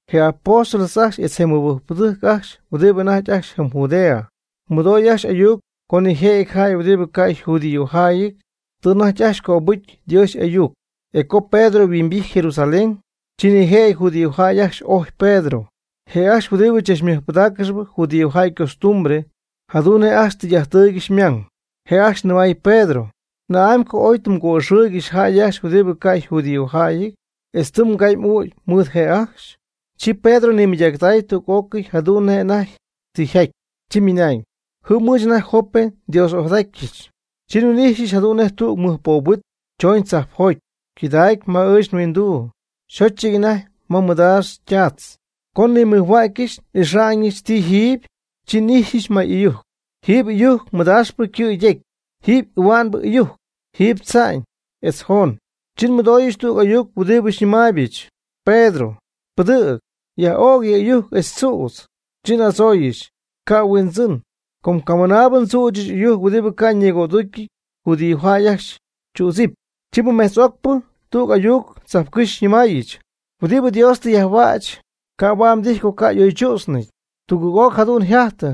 Je apóstoles ajcxy etz je mɨbɨjcpɨdɨjc ajcxy huɨdi anajty ajcxy jɨm Judea, mɨdoy ajcxy ayuc co nijëjɨty jäy huɨdi ca' yjudíojäyɨty tɨ anajty ajcxy cöbɨ́jcɨy Dios y'ayuc. E co Pedro yhuimbijty Jerusalén, chi nijëjɨty judíojäy ajcxy ojy Pedro, je' ajcxy huɨdibɨ tzachmɨjpɨdaaccɨxp judíojäy ycostumbre jadu'n nej ajcxy tɨy'ajttɨɨygɨxy ymang. Je' ajcxy nɨmay Pedro: ―¿Na'amy co oy tɨ mgo'ixɨɨy jäy ajcxy huɨdi ca' yjudíojäyɨty, etz tɨ mgay m'ügy mɨɨd je' ajcxy? Chi Pedro nimɨydactay tüg'ócɨy jadu'n nej anajty tɨ yjaty, chi ymɨnañ: ―Jɨm ɨɨch anajty Jope nDios'ojadatyɨch. Chi nhuin'ijxyɨch jadu'n nej tüg mɨj poob huit chooñ tzajpjoty, cɨdägy ma ɨɨch nhuinduu, xóchɨty anajty ma mɨdaax ytaatz. Co nnimɨjhuägyɨch n'ixa'ñɨch ti jiiby, chi n'ijxyɨch may ɨyujc, jiiby ɨyujc mɨdaaxpɨ ycɨ' ytecy, jiiby ahua'nbɨ ɨyujc, jiiby tza'ñ, etz joon. Chi nmɨdooyɨch tüg ayuc huɨdibɨ xyñɨmaaybɨch: “Pedro, pɨdɨ̈g, yaj'ög yɨ ɨyujc etz tzüdz.” Chi n'adzooyɨch: “Ca' Huindzɨn, com camɨnaabɨ ndzüchɨch ɨyujc huɨdibɨ ca' ñigo'adúcyɨty judíojäy ajcxy tzüdzɨpy.” Chi mɨmetz'ocpɨ tüg ayuc tzajpcɨ́xy xyñɨmäyɨch: “Huɨdi Dios tɨ yajhuäch, ca' huaad mdijy co ca' y'oychú'tznɨty.” Tugɨɨg'oc jadu'n yjajtɨ,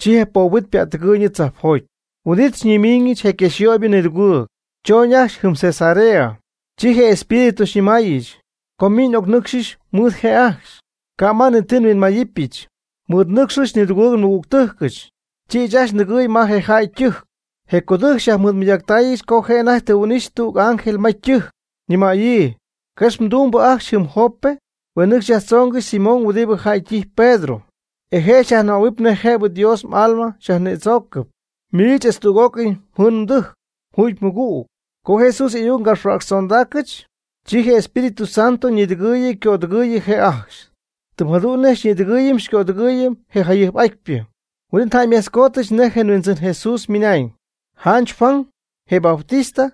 chi je poob huit ypättɨgɨɨyñɨ tzajpjoty. Huin'it xyñimiiñɨch je quexyöybɨ nidugɨɨg, chooñ ajcxy jɨm Cesarea. Chi je Espíritu xyñɨmaayɨch, co min n'ocnɨcxɨch mɨɨd je' ajcxy, ca' ma ni ti nhuinmayɨpyɨch. Mɨɨd nɨcxyɨch nidugɨɨg nmɨgügtɨjcɨch. Chi ɨɨch ajcxy ndɨgɨɨy ma je jäy ytɨjc. Je codɨjc xyajmɨɨdmɨydaacɨch co je' anajty tɨ huin'ixy tüg ángel ma ytɨjc, ñɨmäyii: “Quex mdumbɨ ajcxy jɨm Jope huen nɨcxy yajtzoongɨxy Simón huɨdibɨ jäy ytijpy Pedro, e je' xyajnɨmähuɨp nej jëbɨ Dios m'alma xyajnïdzoocɨp, miich etz tüg'ócɨy mjɨɨn mdɨjc mjuugy-mɨgüg.” Co Jesús y'ayuc ngapxhuäcxtzondaacɨch, chi je Espíritu Santo ñïdɨgɨɨyɨ ycödɨgɨɨyɨ je' ajcxy. Tɨm jadu'n nej xyñïdɨgɨɨyɨm xycödɨgɨɨyɨm je jayɨjp'atypɨ. Huin'it njäymejtzcoodyɨch nej je Huindzɨn Jesús ymɨnañ: “Janch Juan, je Bautista,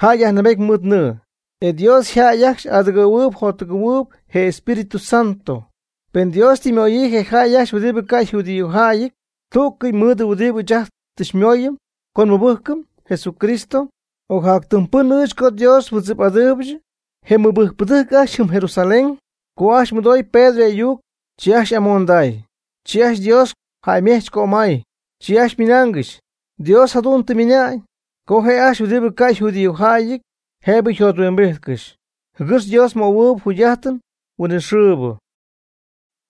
jäy yajnɨɨbejt mɨɨd nɨɨ, e Dios jäy ajcxy y'adɨgɨ̈huɨɨyb yjottɨgɨ̈huɨɨyb je Espíritu Santo.” Pen Dios tɨ ymöyii je jäy ajcxy huɨdibɨ ca' yjudíojäyɨty tú'cɨy mɨɨd huɨdibɨ ɨɨch ajt tɨ xymooyɨm co nmɨbɨ́jcɨm Jesucristo. ¿Ocjactɨm pɨn ɨɨch co Dios nmɨdzɨp'adɨɨybɨch? Je mɨbɨjcpɨdɨjc ajcxy jɨm Jerusalén, co ajcxy mɨdoy Pedro y'ayuc, chi ajcxy y'amonday. Chi ajcxy Dios jäymejch cömay, chi ajcxy ymɨnaangɨxy: “Dios jadu'n tɨ ymɨna'ñ co je' ajcxy huɨdibɨ ca' yjudíojäyɨty jëbɨ yjothuimbijtcɨxy, jɨgɨx Dios ymöhuɨɨyb jugy'ájtɨn huinɨxɨɨbɨ.”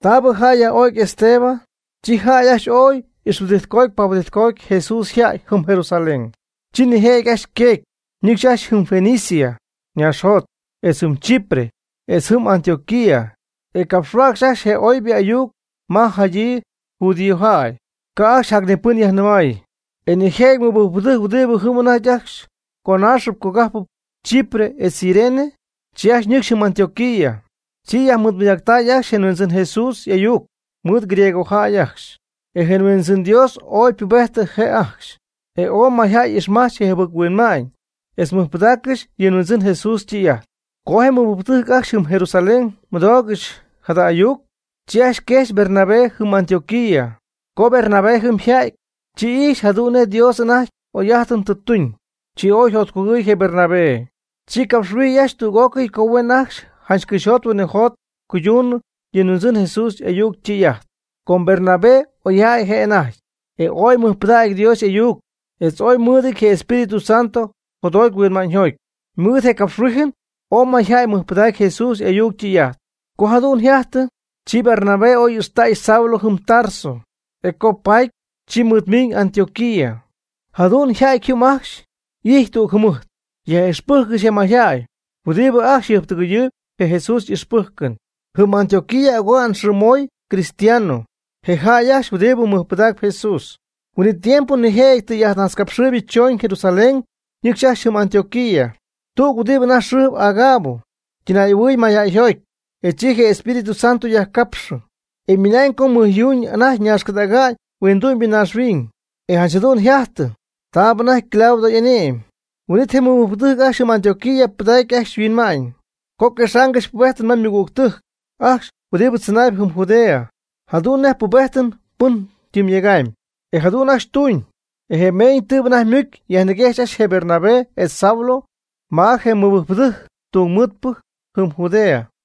Taabɨ jäy yaj'o'cy Esteban, chi jäy ajcxy ooy ixhuɨdijtcoty pahuɨdijtcoty Jesús yjäy jɨm Jerusalén. Chi nijëjɨty ajcxy yqueecy, nɨcxy ajcxy jɨm Fenicia ñaaxjot, etz jɨm Chipre, etz jɨm Antioquía. E capxhuäcxy ajcxy je oybɨ ayuc ma jadyii judíojäy, ca' ajcxy jac ni pɨn yajnɨmay. E nijëjɨty mɨbɨjcpɨdɨjc huɨdibɨ jɨm anajty ajcxy yconaaxɨp ycogájpɨp Chipre etz Cirene, chi ajcxy ñɨcxy jɨm Antioquía. Chi yajmɨɨdmɨydacy ajcxy je Huindzɨn Jesús y'ayuc mɨɨd griegojäy ajcxy. E je Huindzɨn Dios ooy ypubejtɨ je' ajcxy, e ooy mayjäy ixmajch je jɨbɨc-huinma'ñ etz mɨjpɨdaaccɨxy yɨ Huindzɨn Jesús ytɨy'ajt. Co je mɨbɨjcpɨdɨjc ajcxy jɨm Jerusalén mɨdoogɨxy jada ayuc, chi ajcxy quejxy Bernabé jɨm Antioquía. Co Bernabé jɨm yja'ty, chi ijxy jadu'n nej Dios anajty oy'ájtɨn tɨ tuñ, chi oy yjotcugɨɨy je Bernabé. Chi capxhuijy tüg'ócɨy co huen ajcxy janch cɨxyjot huinɨjot cuyduunɨ yɨ Huindzɨn Jesús y'ayuc ytɨy'ajt. Com Bernabé oyjäy je' anajty, e ooy mɨjpɨdägy Dios y'ayuc etz ooy mɨɨdɨty je Espíritu Santo jotjoty huinma'ñyjoty. Ymɨɨd je' ycapxhuíjɨn ooy mayjäy mɨjpɨdacy Jesús y'ayuc ytɨy'ajt. Co jadu'n yjajtɨ, chi Bernabé oy ixtay Saulo jɨm Tarso, e co paty, chi mɨɨdmiiñ Antioquía. Jadu'n yjajty jɨm ajcxy y'ijty tüg jɨmɨjt, yaj'ixpɨjccɨxy je mayjäy huɨdibɨ ajcxy jɨjptɨgɨyɨɨy je Jesús y'ixpɨ́jcɨn. Jɨm Antioquía oga'n yxɨɨmoy cristiano, je jäy ajcxy huɨdibɨ mɨjpɨdacp Jesús. Huin'it tiempo nijëjɨty tɨy'ajtnajtzcapxɨɨybɨ chooñ Jerusalén ñɨcxy ajcxy jɨm Antioquía. Tüg huɨdi anajty yxɨɨ Agabo ytɨnay'ahuɨɨy mayjäyjoty, e chi je Espíritu Santo yajcapxɨ, e ymɨnañ co mɨjyuu anajty ñaxcɨdäga'ñ huindu'ñybɨ naaxhuiñ. E janch jadu'n yjajtɨ taab anajty Claudio y'ane'my. Huin'it je mɨbɨjcpɨdɨjc ajcxy jɨm Antioquía pɨdacy ajcxy yhuinma'ñ co quexaangɨxy pubéjtɨn ma ymɨgügtɨjc ajcxy huɨdi tzɨnaayb jɨm Judea, jadu'n nej pubéjtɨn pɨn tɨm yega'ñ. E jadu'n ajcxy tuuñ. E je meeñ tɨɨbɨ anajty ymucy yajmɨguejxy ajcxy je Bernabé etz Saulo ma je mɨbɨjcpɨdɨjc tungmɨɨdpɨ jɨm Judea.